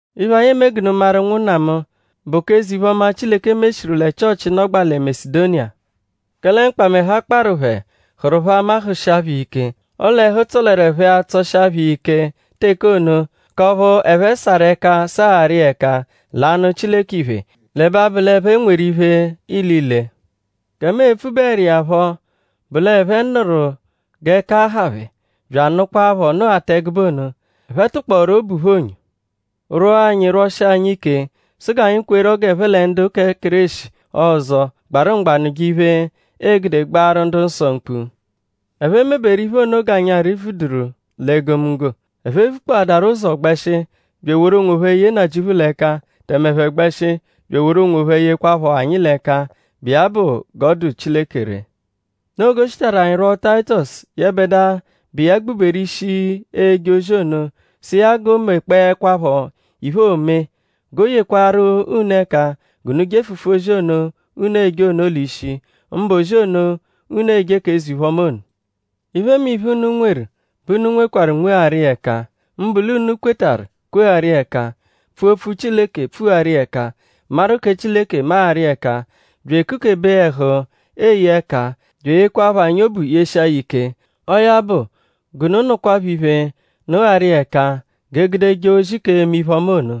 Iphe, anyi eme g'unu maru; ụnwunna mu; bụ k'eze-iphe-ọma, Chileke meshiru lẹ Chịochi, nọgbaa lẹ Masedoniya. Kẹle mkpamẹhu, a kparụ phẹ hụru phẹ ama hụshia phẹ iya ike. Ọle ẹhu tsọleru phẹ-a tsọshia phẹ iya ike teke ono; k'ọphu ẹphe sarụ ẹka sagharu iya ẹka l'anụ Chileke iphe; l'ẹbe abụ l'ẹphe nweru iphe ilile. Gẹ mu e-pfubeẹru iya phọ bụ l'ẹphe nụru g'ẹka ha phẹ; bya anụkwapho nụghata ẹgube ono. Ẹphe tụkpooru obu phẹ onyo rwọo anyi rwọshia anyi ike sụ g'anyi kwerọ g'ẹphe lẹ ndu kẹ Kéreshi ọzo gbarụ mgba nụje iphe, g'e gude gbaaru ndu-nsọ mkpu. Ẹphe meberu iphe ono g'anyi arị-vujeduru l'egomunggo. Ẹphe vukpọadaru ụzo gbẹshi bya eworu onwophẹ ye Nnajịuphu l'ẹka; tẹme ẹphe gbẹshi bya eworu onwophẹ yehụkwapho anyi l'ẹka, bụ iya bụ g'ọ dụ Chileke ree. Noo g'o shitaru anyi rwọo Tayitọsu; yẹbedua, bụ iya gbuberu ishi eje ozi ono; sụ iya g'o mekpọekwapho iphe, oome; g'o yekwarụ unu ẹka g'unu jefụfu ozi ono, unu eje ono l'ishi; mbụ ozi ono, unu eje k'eze-iphe-ọma ono. Iphemiphe, unu nweru bẹ unu nwekwarụ nwegharu iya ẹka; mbụ l'unu kwetarụ kwegharu iya ẹka; pfua opfu Chileke pfugharu iya ẹka; maru kẹ Chileke magharu iya ẹka; bya ekukebe ẹhu eye ẹka; bya eyekwaaphọ anyi obu yeshia ya ike. Ọo ya bụ g'unu nụkwapho iphe nụgharu iya ẹka g'e gude jee ozi k'eme iphe-ọma ono.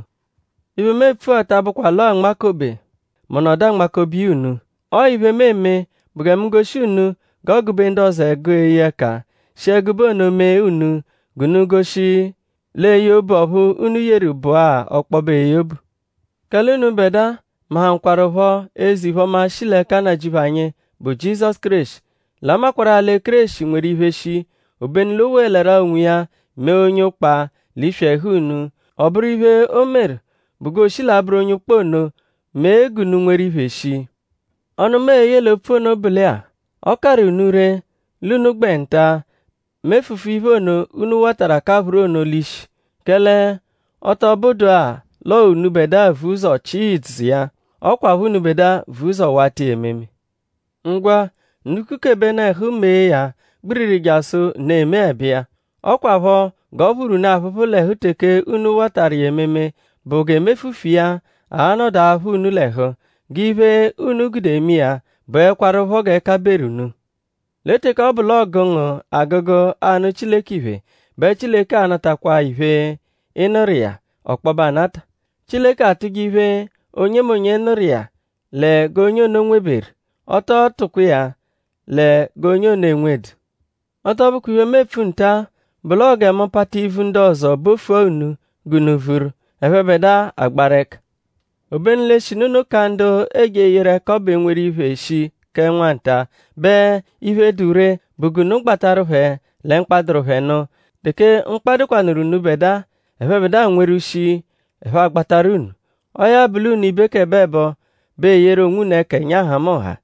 Iphe, mu epfua ta abụkwa l'ọo anmakobe; mu nọdu anmakobe iya unu. Ọo iphe, mu eme bụ gẹ mu goshi unu g'ọogu-be ndu ọzo ẹgu eye ẹka; shi ẹgube ono mee unu g'unu goshi l'eye obu ọphu unu yeru bụa ọkpobe eye obu. Kẹle unubẹdua mahụkwarupho eze-iphe-ọma, shi l'ẹka Nnajịuphu anyi, bụ Jizọsu Kéreshi; l'a makwarụ-a lẹ Kéreshi nweru iphe shii; obenu l'o wolẹru-a onwiya mee onye ụkpa l'iswi ẹhu unu. Ọ bụru iphe, o meru bụ g'oo-shi l'abụru onye ụkpa ono mee g'unu nweru iphe shii. Ọnu, mu e-ye l'opfu ono bụ lẹ-a; ọ karụ unu ree l'unu gbẹ nta-a mefufu iphe ono, unu watarụ akaphụru ono l'ishi; kẹle ọ tọ bụdua l'ọo unubẹdua vu ụzo chịa ìdzù iya; ọ kwaphọ unubẹdua vu ụzo wata iya ememe. Ngwa; unu kukebenu ẹhu mee ya gbiriri jasụ unu emeẹbe iya. Ọ kwaphọ g'ọ phụru unu aphụphu l'ẹhu teke unu watarụ iya ememe bụ g'emefufu iya a-nọdu aphụ unu l'ẹhu. G'iphe, unu gude eme iya bụekwarupho g'ẹka beru unu. Lẹ teke ọ bụ l'ọogu ngu agụgu anụ Chileke iphe; bẹ Chileke a-natakwaa iphe, ị nụru iya ọkpobe anata. Chileke atụje iphe, onyemonye nụru iya lẹ g'onye ono nweberu. Ọ tọo tụkwa iya lẹ g'onye ono enwedu. Ọ tọ bụkwa iphe, mu epfu nta-a bụ l'ọo gẹ mu pata ivu ndu ọzo bofua unu g'unu vuru; ẹphebedua agbaru ẹka. Obenu l'eshinu unu ka ndu eeje eyeru ẹka ọbu enweru iphe shii kẹ nwa nta; bẹ iphe, dụ ree bụ g'unu gbatarụ phẹ lẹ mkpa, dụru phẹ nụ. Teke mkpa dụkwanuru unubẹdua; ẹphebedua nweru shii ẹphe a-gbatarụ unu. Ọo ya bụ l'unu ibekẹboebo bẹ eyeru onwunu ẹka ẹnya nhamụnha.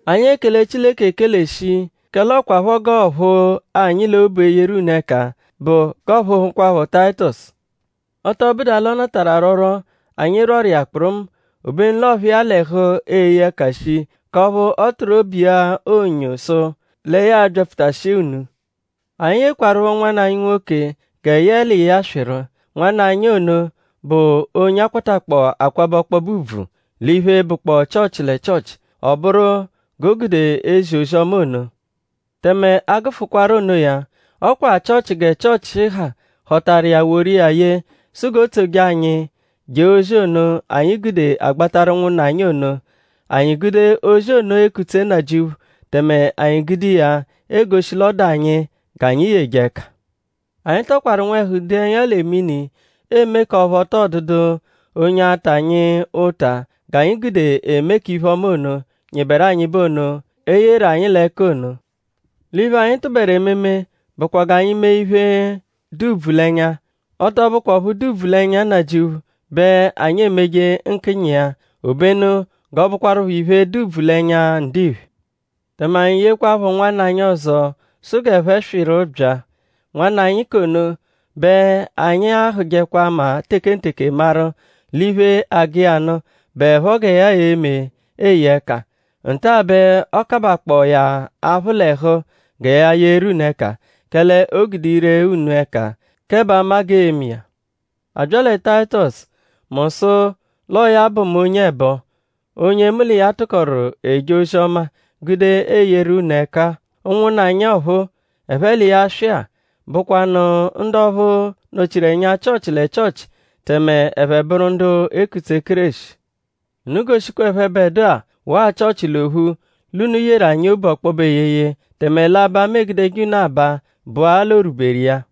Anyi ekele Chileke ekele shii kẹ l'ọ kwaphọ g'ọophu anyi l'obu eyeru unu ẹka bụ g'ọophuhukwapho Tayitọsu. Ọ tọ bụdua l'ọ natarụ arwọrwo, anyi rwọru iya kpụrumu; obenu l'ọophu iya l'ẹhu eye ẹka shii k'ọphu ọ tụru obu iya onyo sụ lẹ ya a-byapfutashia unu. Anyi yekwarụpho nwanna anyi nwoke gẹ yẹe l'iya swịru. Nwanna anyi ono bụ onye a kwatakpọo akwabẹ ọkpobe ùbvù l'iphe, bụkpoo Chịochi lẹ Chịochi. Ọ bụru g'o gude ezi ozi-ọma ono. Tẹme a -gụfukwaro onoya; ọ kwa Chịochi gẹ Chịochi ha họtaru iya woru iya ye sụ g'o tsoje anyi je ozi ono, anyi gude agbatarụ ụnwunna anyi ono. Anyi gude ozi ono ekutse Nnajịuphu tẹme anyi gude iya egoshi l'ọ dụ anyi g'anyi yeje ẹka. Anyi tọkwaru nwẹhu dee ẹnya lẹ mini eme k'ọphu ọ tọo dụdu onye a-ta anyi ụta g'anyi gude eme k'iphe-ọma ono, nyịberu anyịbe ono, e yeru anyi l'ẹka ono. L'iphe, anyi tụberu ememe bụkwa g'anyi meje iphe, dụ ùbvù l'ẹnya; ọ tọ bụkwaa ọphu dụ ùbvù l'ẹnya Nnajịuphu bẹ anyi e-meje nkịnyi iya; obenu g'ọ bụkwarupho iphe, dụ ùbvù l'ẹnya ndiphe. Tẹme anyi yekwaphọ nwanna anyi ọzo sụ g'ẹphe swịru bya. Nwanna anyi k'ono bẹ anyi ahụjekwa ama tekenteke maru l'iphe, agụ iya nụ bụepho gẹ ya e-me eye ẹka. Nta-a bẹ ọ kabakpọo ya aphụ l'ẹhu gẹ ya yeru unu ẹka; kẹle o gude ire unu ẹka kẹ b'ama g'e-me iya. A bya lẹ Tayitọsu; mu sụ l'ọo ya bụ mu onye ẹbo; onye mu l'iya tụkoru eje ozi-ọma gude eyeru unu ẹka-a. Ụnwunna anyi ọphuu, ẹphe l'iya swị-a bụkwanu ndu ọphu nọ-chiru ẹnya Chịochi lẹ Chịochi tẹme ẹphe bụru ndu ekutse Kéreshi. Unu goshikwa ẹphebedua waa Chịochi l'ophu l'unu yeru anyi obu ọkpobe eyeye; tẹme l'aba, mu egudeje unu aba bụ-a l'o rwuberu iya.